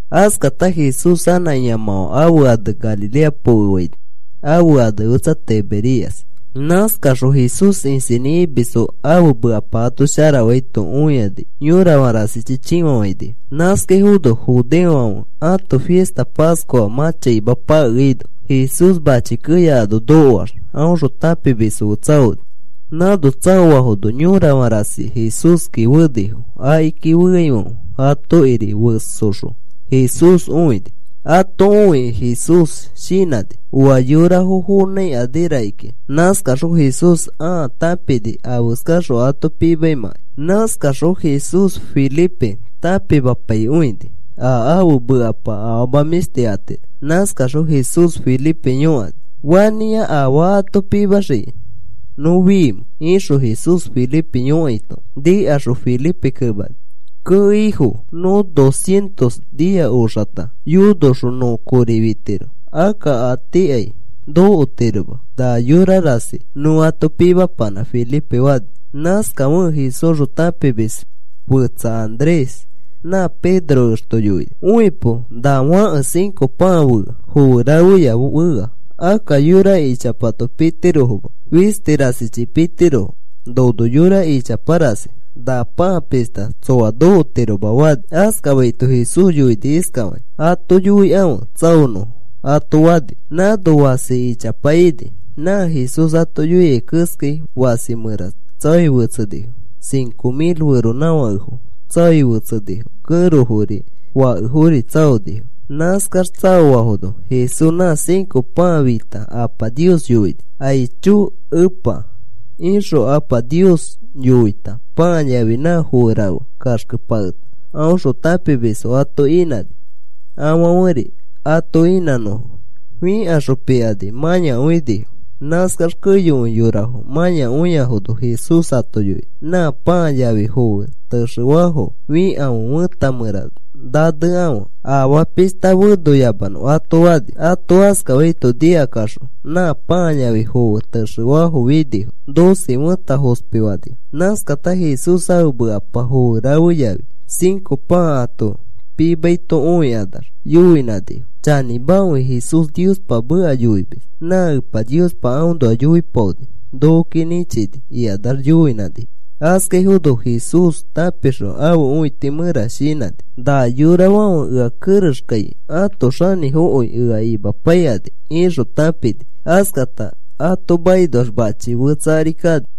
Askata Jesús anã ĩamãfã ãfe ane Galilea pokefaini. Ãfe ane fetsa Tiberias. Nãskaxõ Jesús isinĩ imisfo ãfe mekapa ato sharafaito õikani yorafã rasichi chĩfafainifo. Nãskaifono judeofãfe ãto fista Pascua mã chaima pakeaino Jesús mãchi keya ano nokoax aõxõ tãpimisfo fe tsaoni. Nãno tsaoafono yorafã rasi Jesúski fenifo. Akiki feaifãfe atokiri fesoxõ Jesús õini. (Ato õikĩ Jesús shinãni oa yorafo fonãikani rakikĩa. Nãskaxõ Jesús ãa tãpini afeskaxõ ato pimaimãkai.) Nãskaxõ Jesús Felipe tãpimapaikõini a ãfe mekapa afama mĩshti atiro. Nãskaxõ Jesús Felipe yõkani: “¿Fanĩa afaa ato pimaxikĩ nõ fimẽ?” ixõ Jesús Felipe yõkaito, nikaxõ Felipe kemani: “Kee, Ifo, nõ dos cientos nia oxata yonoxõ nõ kori fitiro akka a tiikai nokotiroma na yorafã rasi nõ ato pimapanã,” Felipe fani. Nãskafekẽ Jesúsxõ tãpimis fetsa Andrés nã Pedro ẽxto yoini: “Õipo. Na fãke cinco pãa fea. Foe rafeya fea. Akka yora ichapato pitirofoma. Fisti rasichi pitirofo. Nono yora ichapa rasi. Na pãa pishta tsoa nokotiroma,” fani. Askafaito Jesús yoini iskafakĩ: “Ato yoikãfe tsaonõfo,” ato fani. Nãno fasi ichapa ini. Nã Jesús ato yoiai keskai fasi mẽra tsaoi fetsenifo. Cinco mil feronãfakefo tsaoi fetsenifo. Kẽrofori, fakefori tsaonifo. Nãskax tsaofafono Jesús nã cinco pãa fita Apa Nios yoini: “Aicho, Epa,” ixõ Apa Nios yoita pãa yafi nã foe rafe kaxkepaketa aõxõ tãpimisfo ato inãni, afãferi ato inãnõfo. Fikaxõ pikani mãyakõinifo. Nãskax keyokõi yorafo mãyakõiafono Jesús ato yoini: “Nã pãa yafi foe texefafo fikãfe fẽta mẽra nanekãfe afaa pishta fenoyamanõ,” ato fani. Ato askafaito nikakaxõ nã pãa yafi foe texefafo finifo. Doce fẽta fospifanifo. Nãskata Jesús ãfe mekapa foe rafe yafi cinco pãa ato pimaito õikanax yoinãnifo: “Chanĩmakõi Jesús Niospa meka yoimis. Nã Epa Niospa aõnoa yoipaoni. Nokoki nĩchini,” ikanax yoinãnifo. Askafaifono Jesús tãpixõ ãfe õiti mẽra shinãni: “Na yorafãfe ea kerexkai ãto xanĩfokõi ea imapaikani,” ixõ tãpini. Askata ato makinoax machi fetsa ari kani.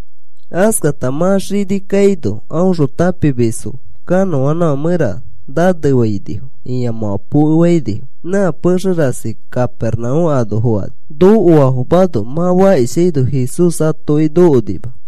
Askata mã xini kaino aõxõ tãpimisfo kanõanãfã mẽra nanefainifo ĩamãfã pokefainifo nã pexe rasi Capernaúm ano fokani. Nokoafomano mã fakishaino Jesús atoki nokonima.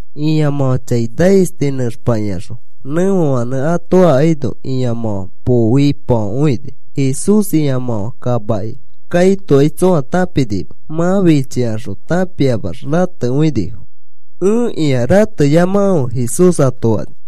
Ĩamãfã chai naisti nẽxpakĩaxõ nẽfefãnẽ ato akaino ĩamãfã pooitifakõini. Jesús ĩamãfã kamaki kaitokai tsõa tãpinima mã fichifikaxõ. Tãpiamax ratekõinifo. “Ẽkĩa. Rateyamakãfe,” Jesús ato fani.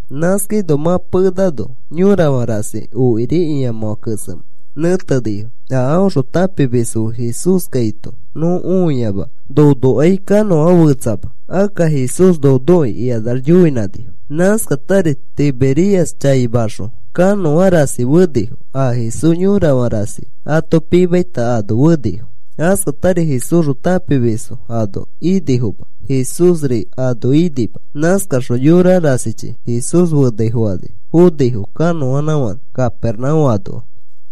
Nãskaino mã penano yorafã rasi okiri ĩamãfã kesemẽ nẽtenifo. “A aõxõ tãpimisfo fe Jesús kaito nõ õiama. Nonokai kanõa fetsama. Akka Jesús nonoki,” ikanax yoinãnifo. Nãskatari Tiberias chaimaxõ kanõa rasi fenifo. A Jesús yorafã rasi ato pimaita ano fenifo. Askatari Jesúsxõ tãpimisfo ano inifoma. Jesúsri ano inima. Nãskaxõ yora rasichi Jesús fenaifokani fonifo kanõanãfãnẽ Capernaúm anoa.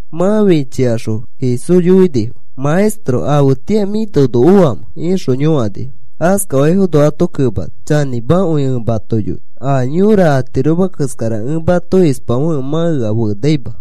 Mã fichikaxõ Jesús yoinifo: “Maestro, ¿afetĩa mĩ nono oamẽ?” ixõ yõkanifo. Askafaifono ato kemani: “Chanĩmakõi ẽ mato yoi. A yõra atiroma keskara ẽ mato ispafekẽ mã ea fenaima.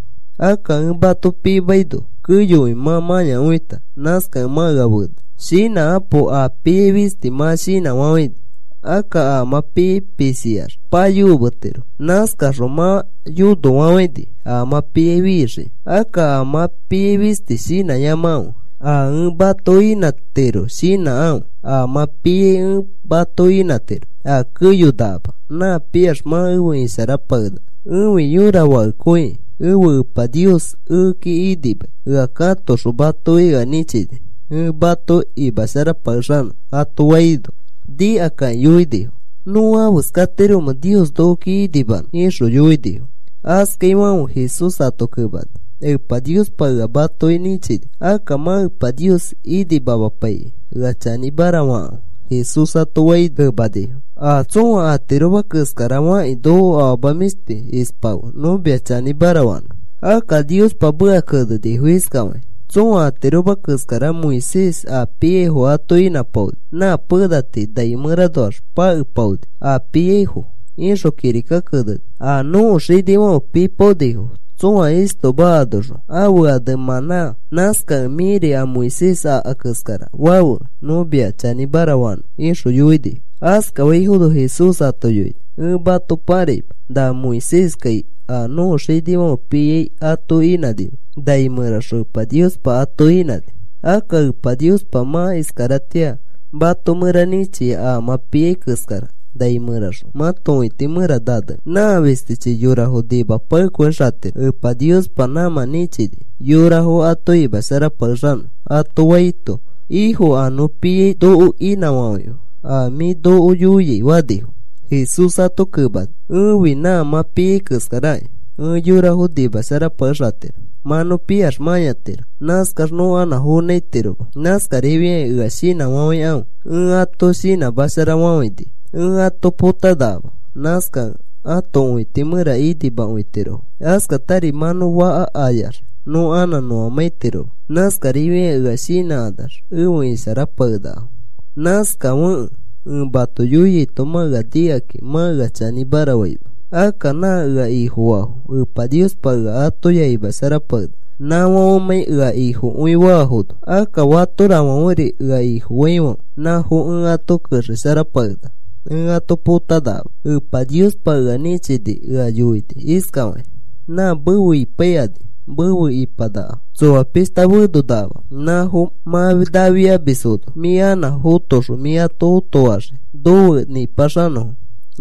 Akka ẽ mato pimaino keyokõi mã mãyakõita. Nãskakẽ mã ea fenai. Shinãkapo. a piai fisti mã shinãfafãini. Akka a mã piai pisiax payokometiro. Nãskaxõ mã yonofafãini a mã piai fixiki. Akka a mã piai fisti shinãyamakãfe. A ẽ mato inãtiro shinãkãfe. A mã piai ẽ mato inãtiro a keyonakama. Nã piax mã efe isharapakenaka. Ẽfi yõra fakekõiki. Ẽfe Epa Nios ekeki inimai ea katoxõ matoki ea nĩchini ẽ mato imasharapakexanõ,” ato faino, nikakakĩ yoinifo: “¿Nõ afeskatiromẽ Nios nokoki inimanõ?” ixõ yoinifo. Askafaifãfe Jesús ato kemani: “Epa Niospa ea matoki nĩchini. Akka mã Epa Nios inimamapaikĩ ea chanĩmara fakãfe,” Jesús ato faino, kemanifo: “A tsõa atiroma keskara fakĩ noko afama mĩshti ispafe nõ mia chanĩmara fanõ. Akka Niospa meka kenenifo iskafakĩ: ‘Tsõa atiroma keskara Moisés a piaifo ato inãpaoni. Nã pena tii nai mẽranoax pakepaoni a piaifo,’ ixõ kirika kenenifo. A nõko xinifãfe pipaonifo tsõa istoma anoxõ ãfe ane mãnã. Nãskakẽ mĩri a Moisés aka keskara fafe, nõ mia chanĩmara fanõ,” ixõ yoinifo. Askafaifono Jesús ato yoini: “Ẽ mato pãraima na Moiséskai a nõko xinifãfe piai ato inãnima, nai mẽraxõ Epa Niospa ato inãni. Akka Epa Niospa mã iskaratĩa mato mẽra nĩchia a mã piai keskara nai mẽraxõ mãto õiti mẽra nanenõ. Nã fistichi yorafo nimapakekõixatiro. Epa Niospa nãmã nĩchini yorafo ato imasharapakexanõ,” ato faito, “Ĩfo, a nõ piai noko inãfafãife a mĩ noko yoiai,” fanifo. Jesús ato kemani: “Ẽfi nã mã piai keskarakĩ. Ẽ yorafo nimasharapakexatiro. Mã nõ piax mãyatiro. Nãskax nõ anã fonãitiroma. Nãskarifiakĩ ea shinãifãfe ẽ ato shinãmafafãini. Ẽ ato potanakama. Nãskakẽ ãto õiti mẽra inimakõitirofo. Askatari mã nõ faka ayax nõ anã nõamãitiroma. Nãskarifiakĩ ea shinãkanax efe isharapakenakafo. Nãskafekẽ ẽ mato yoiaito mã ea nikakĩ mã ea chanĩmara faima. Akka nã ea Ifofaafo Epa Niospa ea atoya imasharapakenaka nãfãfemãi ea Ifofakõiafono. Akka fatorafãferi ea Ifofaifãfe nãfo ẽ ato kexesharapakenaka. Ẽ ato potapakenakama. Epa Niospa ea nĩchikĩ ea yoini iskafakĩ: ‘Nã mefe ipaikani mefe ipanakafo tsoa pishta fenonakama. Nãfo mã nafiamisfono mĩ anã fotoxõ mĩ ato õtofaxii nofe nipaxanõfo.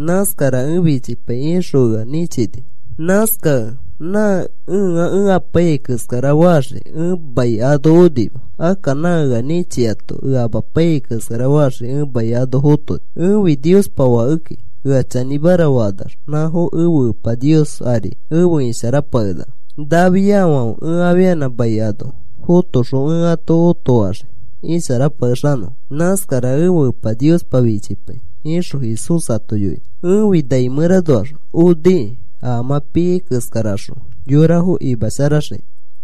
Nãskara ẽ fichipai,’ ixõ ea nĩchini. Nãskakẽ nã ẽa ẽ apaiyai keskara faxiki ẽ mai ano onima. Akka nã ea nĩchiato ea amapaiyai keskara faxikĩ ẽ mai ano fotoni. “Ẽfi Niospa Fakeki. Ea chanĩmara fakanax nãfo ẽfe Epa Nios ari efe isharapakenakafo. Nafiafãfe ẽ afianã mai ano fotoxõ ẽ ato õtofaxii isharapakexanõfo. Nãskara ẽfe Epa Niospa fichipai,” ixõ Jesús ato yoini. “Ẽfi nai mẽranoax onikĩ a mã piai keskaraxõ yorafo imasharaxikĩ,”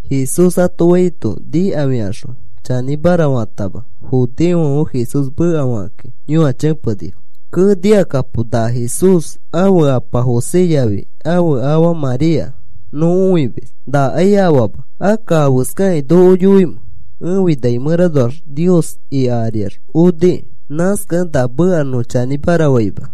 Jesús ato faito nikafikaxõ chanĩmara fatama judeofãfe Jesús mekafakakĩ yõachepenifo: “Kee, nikakapo. Na Jesús, ãfe apa José yafi ãfe afa María nõ õimis. Nakai afaama. Akka, ¿afeskakĩ noko yoimẽ: ‘Ẽfi nai mẽranoax Nios ika ariax onikĩ?’ Nãskakẽ na meka nõ chanĩmara faima.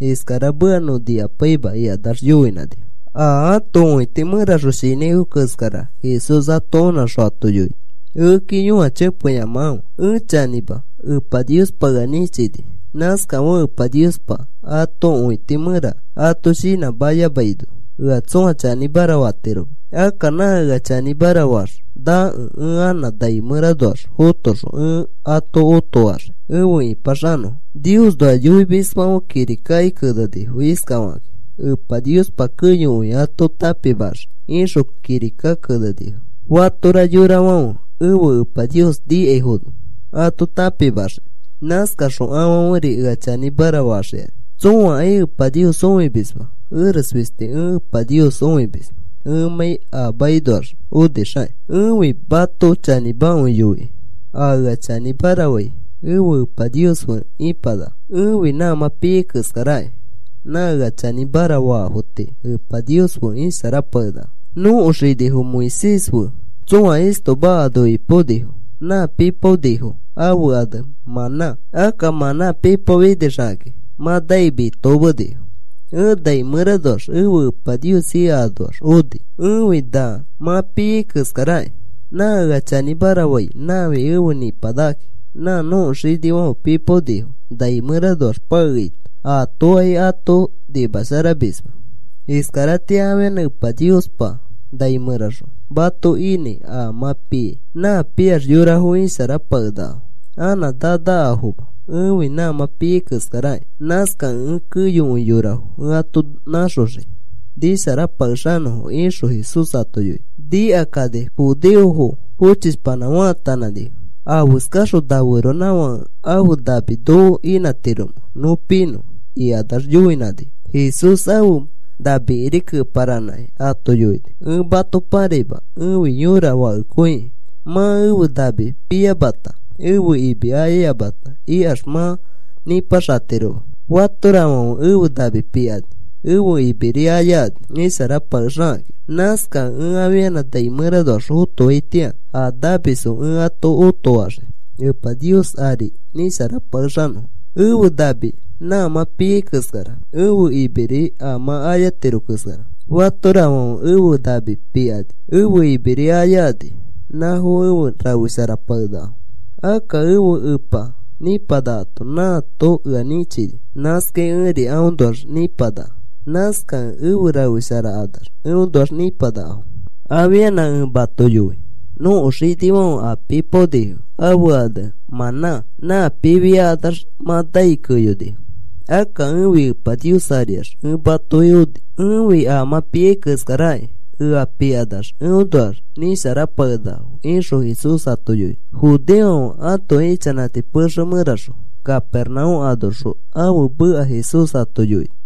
Iskara meka nõ nikapaima,” ikanax yoinãnifo. A ãto õiti mẽraxõ shinãifo keskara Jesús ato onãxõ ato yoini: “Ekeki yõachepeyamakãfe. Ẽ chanĩma. Epa Niospa ea nĩchini. Nãskafekẽ Epa Niospa ãto õiti mẽra ato shinãmayamaino ea tsõa chanĩmara fatiroma. Akka nã ea chanĩmara faax nakẽ ẽ anã nai mẽranoax fotoxõ ẽ ato otofaxii efe ĩpaxanõfo. Niosnoa yoimisfãfe kirika kenenifo iskafakakĩ: ‘Epa Niospa keyokõi ato tãpimaxii,’ ixõ kirika kenenifo. Fatora yorafãfe ẽfe Epa Nios nikaifono ato tãpimaxii. Nãskaxõ afãferi ea chanĩmara faxikani. “Tsõakai Epa Nios õimisma. Eres fisti ẽ Epa Nios õimis, ẽmãi a makinoax onixakĩ. Ẽfi mato chanĩmakõi yoikai. A ea chanĩmara fai ẽfe Epa Nios fe ipanaka. “Ẽfi nã mã piai keskaraki. Nã ea chanĩmara faafo tii Epa Nios fe isharapakenakafo. Nõko xinifo Moisés fe tsõa istoma ano ipaonifo. Nã pipaonifo, ãfe ane mãnã. Akka mãnã pipaofinixakĩ mã nai mitokomenifo. Ẽ nai mẽranoax ẽfe Epa Nios ika anoax oni. Ẽfi na mã piai keskaraki. Nã ea chanĩmara fai nãfi efe nĩpanakakĩ. Nã nõko xinifãfe pipaonifo nai mẽranoax pakeaito aatokai ato nimasharamisma. Iskaratĩa afianã Epa Niospa nai mẽraxõ mato inãi a mã piai. Nã piax yorafo isharapakenakafo anã nanakafoma. Ẽfi nã mã piai keskaraki. Nãskakẽ ẽ keyokõi yorafo ẽ ato nãxoxii nisharapakexanõfo,” ixõ Jesús ato yoini. Nikakani judeofo fochishpanã faatanãnifo. “¿Afeskaxõ na feronãfãke ãfe nami noko inãtiromẽ nõ pinõ?” ikanax yoinãnifo. Jesús ãfe namikiri keparanãkĩ ato yoini: “Ẽ mato pãraima. Ẽfi yõra fakekõiki. Mã ẽfe nami piyamata ẽfe imi ayayamata ikax mã nipaxatiroma. Fatorafãfe ẽfe nami pikani ẽfe imiri ayakani isharapakexikakĩ. Nãskakẽ ẽ afianã nai mẽranoax fotoaitĩa a namisfo ẽ ato otofaxii Epa Nios ari nisharapakexanõfo. Ẽfe nami na mã piai keskara. Ẽfe imiri a mã ayatiro keskara. Fatorafãfe ẽfe nami pikani, ẽfe imiri ayakani, nãfo efe rafesharapakenakafo. Akka ẽfe Epa nĩpanakato nãato ea nĩchini. Nãskai ẽri aõnoax nipanaka. Nãskakẽ efe rafesharakanax eõnoax nĩpanakafo. “Afianã ẽ mato yoi. Nõko xinifãfe a pipaonifo ãfe ane mãnã. Nã pifiakanax mã nai keyonifo. Akka ẽfi Epa Nios ariax ẽ matoki oni. Ẽfi a mã piai keskarakĩ. Ea pikanax eõnoax nisharapakenakafo,” ixõ Jesús ato yoini. Judeofãfe ãto ichanãti pexe mẽraxõ Capernaúm anoxõ ãfe meka Jesús ato yoini.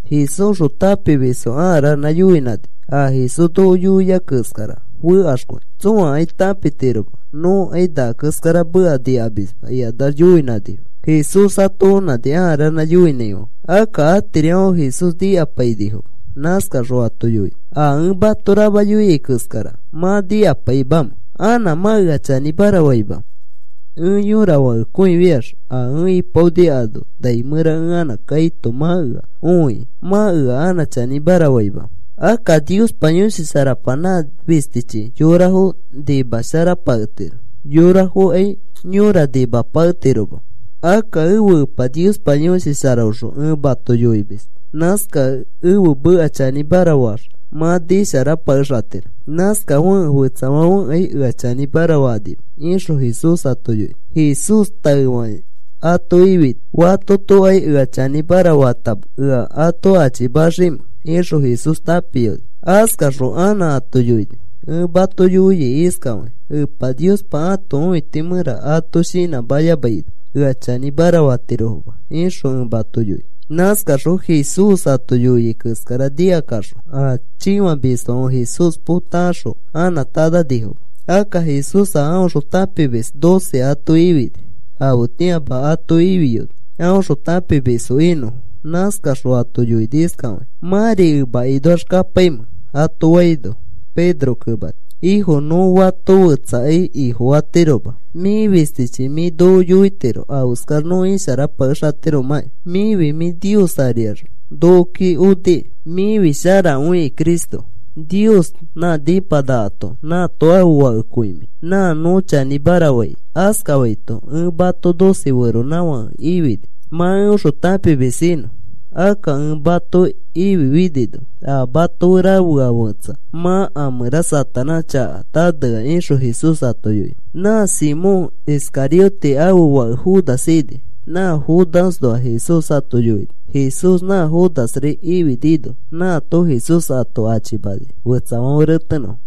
Jesúsxõ tãpimisfo a ranã yoinãnifo: “A Jesús noko yoia keskara fekaxkõi. Tsõakai tãpitiroma. Nõkai na keskara meka nikamisma,” ikanax yoinãnifo. Jesús ato onãni a ranã yoinãifãfe. Akka atirifãfe Jesús nikapainifoma. Nãskaxõ ato yoini: “¿A ẽ mato rama yoia keskara mã nikapaimamẽ? ¿Anã mã ea chanĩmara faimamẽ? Ẽ yõra fakekõi fiax a ẽ ipaoni ano nai mẽra ẽ anã kaito mã ea õiki, ¿mã ea chanĩmara faimamẽ? Akka Niospa Yõshi Sharapa nã fistichi yorafo nimasharapaketiro. Yorafokai yõra nimapaketiroma. Akka ẽfe Epa Niospa Yõshi Sharaõxõ ẽ mato yoimis. Nãskakẽ ẽfe meka chanĩmara faax mã nisharapakexatiro. Nãskafekẽ fetsafãfekai ea chanĩmara fakanima,” ixõ Jesús ato yoini. Jesús taefakĩ ato ifini. “Fatotokai ea chanĩmara fatama ea ato achimaximẽ,” ixõ Jesús tãpiyoni. Askaxõ anã ato yoini: “Ẽ mato yoia iskafakĩ, Epa Niospa ãto õiti mẽra ato shinãmayamaino ea chanĩmara fatirofoma,” ixõ ẽ mato yoia. Nãskaxõ Jesús ato yoiai keskara nikakaxõ a chĩfamisfãfe Jesús potakaxõ anã tananifoma. Akka Jesús a aõxõ tãpimis doce ato ifini. Afetĩama ato ifiyoni aõxõ tãpimisfo inõfo. Nãskaxõ ato yoini iskafakĩ: “¿Mãri emakinoax kapaimẽ?” ato faino, Pedro kemani: “Ifo, nõ fato fetsakai Ifofatiroma. Mĩ fistichi mĩ noko yoitiro afeskax nõ isharapakexatiromãkĩ. Mĩfi mĩ Nios ariax nokoki oniki. Mĩfi sharakõi Cristokĩ. Nios nã nipanakato nãato ãfe Fakekõi mĩ. Nã nõ chanĩmara fai,” askafaito, “Ẽ mato doce feronãfake ifini mã eõxõ tãpimis inõ. Akka ẽ mato ififinino a mato fe rafea fetsa mã a mẽra Satanás chaka nanea,” ixõ Jesús ato yoini. Nã Simón Iscariote ãfe fake Judas ini. Nã Judasnoa Jesús ato yoini. Jesús nã Judasri ififinino nãato Jesús ato achimani fetsafãfe retenõfo.